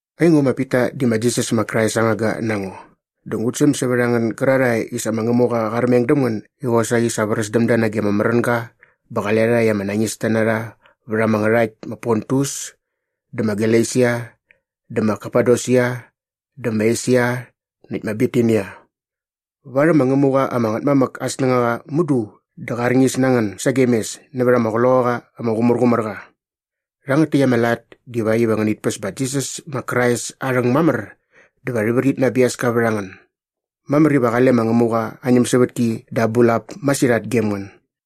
Aingo ma Pita di ma Jisas ma Krais aa ngangga na ngo dä ngut säm sävät a ngän gärarhae i sa ma Ngämuqa qa armeng däm ngän i qosaqi sa vräs däm da nage ama märänga bä qale rha i ama nañista na rha vät ama ngärhakt ma Pontus dä ma Galesia dä ma Kapadosia dä ma Esia näkt ma Bitinia. Varhäm ma Ngämuqa ama Ngätmamäk aa snängaqa mudu dä qa arñis na ngän sagem mes nävät ama Qloqaqa ama Qumärqumärqa. Rhangät täkt ama lat divakt iva ngänit päs ma Jisas ma Krais aa rhäng mamär dä va rhi vrit na aa biaska vät a ngän. Mamär iva qale ma Ngämuqa aa ñämsävätki dä aa bulap masirhat gem ngän.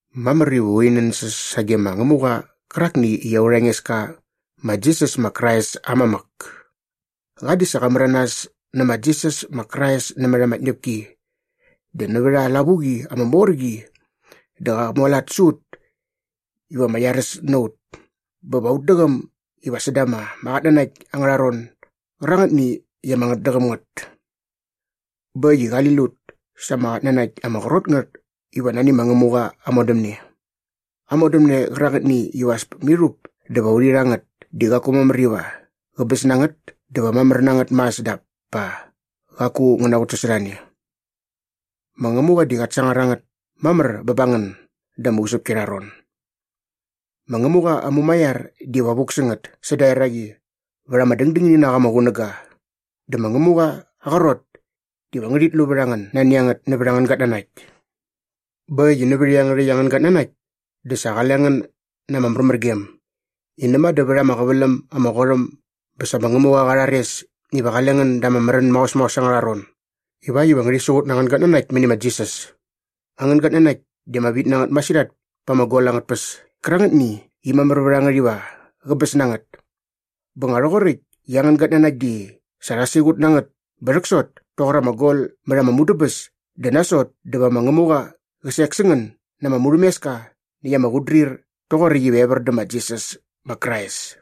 Mamär iva urhi nänsäs sage ma Ngämuqa qärakni i aurha Engeska ma Jisas ma Krais aa mamäk! Qa di sa qa märanas nä ma Jisas ma Krais nämät ama tñäpki dä nävät aa lavuqi ama mor qi di qa mualat sä ut iva ama iaräs na ut bä va ut däqäm iva säda ama qatnanakt angärha ron gärangätni i ama ngätdäqäm ngät. Bä äkt i qali lut sa ama qatnanakt ama qrot ngät iva nani ma Ngämuqa aa modämne. Aa modämne qärangätni iva as mirhup dä va urhi rha ngät di qaku mamär iva qäbäs na ngät dä va mamär na ngät mas dap pa qaku ngä naqutsasorhane. Ma Ngämuqa di qat sangar a ngät mamär bä ba ngän da ama usäpki arha ron. Ma Ngämuqa aa mumaiar diva vuk sä ngät säda eraqi vät ama dängdängini na qa ama qunäga dä ma Ngämuqa aa qrot diva ngärhit lu vät a ngän nani a ngät nävät angän gatnanakt. Bä äkt i nävät iangärhäkt angän gatnanakt dä sa qale ngän na ama märmärgem i näma dä vät ama qäväläm ama qot äm bä sa ma Ngämuqa qa rhares iva qale ngän da ama märän maos maos angärha ron ivakt iva ngärhi siqut na angän gatnanakt mäni ma Jisas. Angän gatnanakt di ama vit na ngät masirhat pa ama gol angät tpäs kärangätni i mamär vät a ngät iva qäbäs na ngät. Bä nga rhoqoräkt i angän gatnanakt di sa rha siqut na ngät bä rhäksot toqor ama gol mät ama mudäbäs dä nasot dä va ma Ngämuqa qä sek sä ngän na ama murhämeska näkt ama qutdrir toqoräkt iva evär dä ma Jisas ma Krais.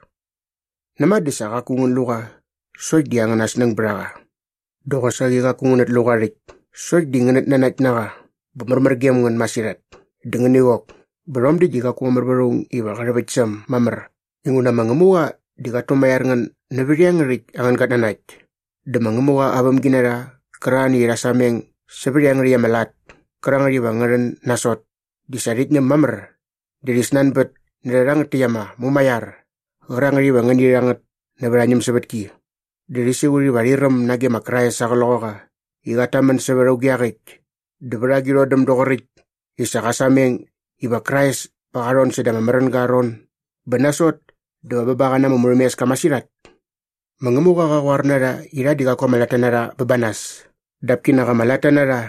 Näma dä sa qaku ngän lu qa sokt di angäna snäng bät a qa. Dä qosaqi qaku ngänät lu qa rhäkt sokt di ngänät nanakt na qa bä märmär gem ngän masirhat dä ngäni qok bä rhom däkt di qaku mamär vät aung iva qä rhäväkt sä äm mamär inguna ma Ngämuqa di qat tumaiar ngän nävät iangärhäkt angän gatnanakt. Dä ma Ngämuqa aa vämginarha qärarhani i rha sameng sävät iangärhäkt ama lat kärangät iva ngä rhän nasot di sa rhit ñäm mamär dä rhi snanbät närhä rhangät täkt ama mumaiar qärangät iva ngäni rha ngät nävät aa ñämsävätki dä rhi siqut iva rhi räm nage ma Krais aa Qloqaqa i qat tamän sävät auge iaqäkt dä vät agi rhodäm doqoräkt i sa qa sameng i ma Krais pa qa rhon säda ama märänga aa ron bä nasot dä va bä ba qa na ama murhämeska masirhat. Ma Ngämuqa qa qoar na rha i rha di qaku ama latta bä ba nas dap kinak ama latta na rha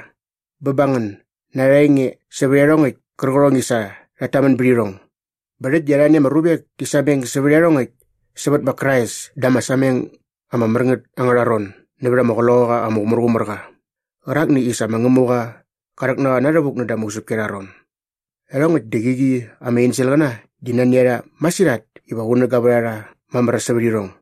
bä ba ngän na arha enge sävät iarhongäkt kärqärhong i sa rhat tamän bät irhong. Bä rhäkt di arhani ama ruvek ti sameng sävät iarhongäkt sävät ma Krais da ama sameng ama mär ngät angärha ron nävät ama Qloqaqa ama Qumärqumärqa qärakni i sa ma Ngämuqa qa rhäk na qa inavuk näda ama usäpki arha ron. Iarhongäkt di qäqi ama enselqäna di nani a rha masirhat iva qunäga vät a rha mamär sävät irhong.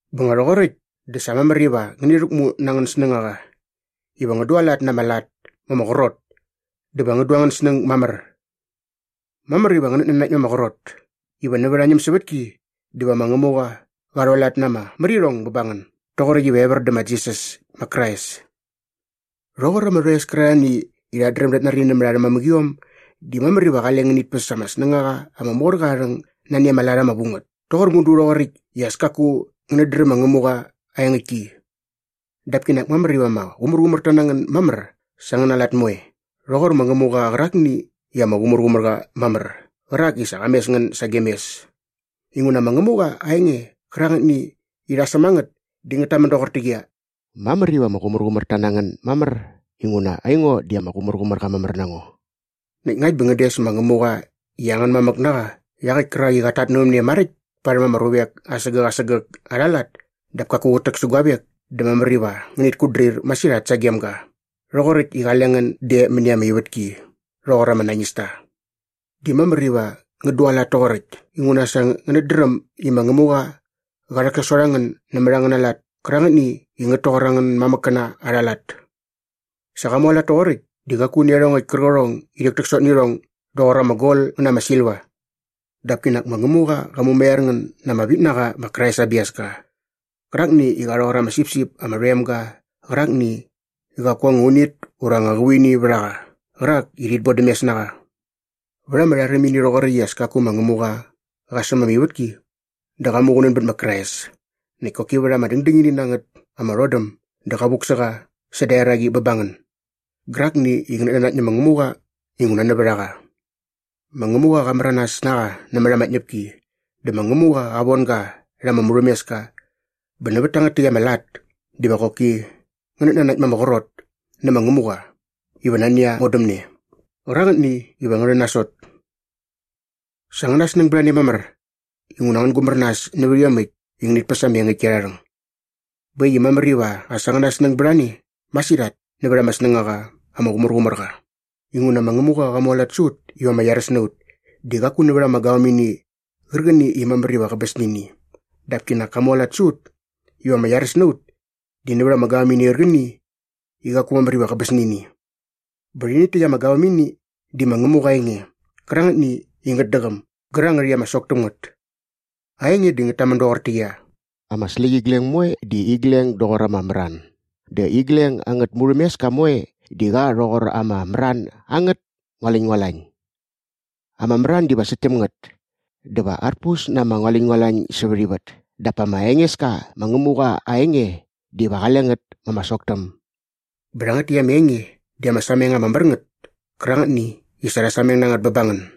Bä nga rhoqoräkt dä sa mamär iva ngäni rhäkmu nä angän snängaqa iva ngän dualat na ama lat ma ama qrot dä va ngän du angän snäng mamär. Mamär iva ngänät nanakt ma ama qrot iva nävät aa ñämsävätki diva ma Ngämuqa qa rhualat na ama märirhong bä ba ngän doqoräkt iva evär dä ma Jisas ma Krais. Rhoqor ama rhoes kärarhani i rhat dräm dat nari nämät arhä mamäqiom di mamär iva qale ngänit päs ama snängaqa ama mor qa aa rhäng nani ama lat ama vu ngät toqor mudu rhoqoräkt i as kaku ngänät dräm ma Ngämuqa aa engäktki. Dap kinak mamär iva ama qumärqumärta na ngän mamär sa angäna lat moe rhoqor ma Ngämuqa qärakni i ama qumärqumär qa mamär qärak i sa qa mes ngän sagem mes inguna ma Ngämuqa aa enge qärangätni i rha säm a ngät di ngät tamän doqortäqyia, “Mamär iva ama qumärqumärta na ngän mamär inguna aingo di ama qumärqumärqa mamär na ngo.” Näkt ngakt bä ngän des ma Ngämuqa i angän mamäk na qa iaqäkt kärak i qat tatnävämne maräkt parhäm ama ruvek asägäk asägäk arha lat dap kaku qät täksä guavek dä mamär iva ngänit kutdrir masirhat sagem ga rhoqoräkt i qale ngän de mäni ama ivätki rhoqor ama nañista. Di mamär iva ngän dualat toqoräkt inguna sa ngänät dräm i ma Ngämuqa qa rhäksasot a ngän nämät angäna lat kärangätni i ngät toqor angän mamäkkäna arha lat. Sa qa mualat toqoräkt di qaku nä iarhongäkt kärqärhong i rhäktäksot nä irhong doqor ama gol ngä na ama silva. Dap kinak ma Ngämuqa qa mumaiar ngän na ama vit na qa ma Krais aa biaska qärakni i qa rhoqor ama sipsip ama rhoem ga qärakni i qaku anga unit ura anga qävuini vät a qa qärak i rhit bodämes na qa. Vät ama rharimini rhoqoräkt i as kaku ma Ngämuqa qa säm ama ivätki dä qa muqunän bät ma Krais näkt koki vät ama dängdängini na ngät ama rhodäm dä qa vuk sä qa säda eraqi bä ba ngän gärakni i ngänät nanakt nä ma Ngämuqa inguna nävät a qa. Ma Ngämuqa qa märanas na qa nämät ama tñäpki dä ma Ngämuqa qa von ga rha ama murhämeska bä nävät tangät täkt ama lat diva qoki ngänät nanakt ma ama qrot nä ma Ngämuqa iva nani aa modämne qärangätni iva ngä rhän nasot. Sa angäna snäng bät a ne mamär inguna ngän gumär nas nävät iomäkt i ngänit päs ama engäktki arha rhäng. Bä äkt i mamär iva as angäna snäng bät a ne masirhat nävät ama snängaqa ama qumärqumär qa inguna ma Ngämuqa qa mualat sä ut iva ama iaräs na ut di qaku nävät ama gavämini qärqäni i mamär iva qäbäs nä ini dap kinak ka mualat sä ut iva ama iaräs na ut di nävät ama gavämini qärqäni i qaku mamär iva qäbäs nä ini. Bä rhäni rhäkt ama gavämini di ma Ngämuqa aa enge qärangätni i ngät däqäm gärangät i ama sok täm ngät. Aa enge di ngät tamän doqortäqyia, “Ama släqyigleng moe di igleng doqor ama mran dä igleng angät murhämeska moe di qa rhoqor ama mran angät ngualäñngualañ. Ama mran diva säkt täm ngät dä va arpus na ama ngualäñngualañ sävät ivät dap ma Engeska ma Ngämuqa aa enge diva qale ngät ma ama sok täm.” Bä rhangät täkt ama enge di ama sameng ama mär ngät kärangätni i sa rha sameng na ngät bä ba ngän.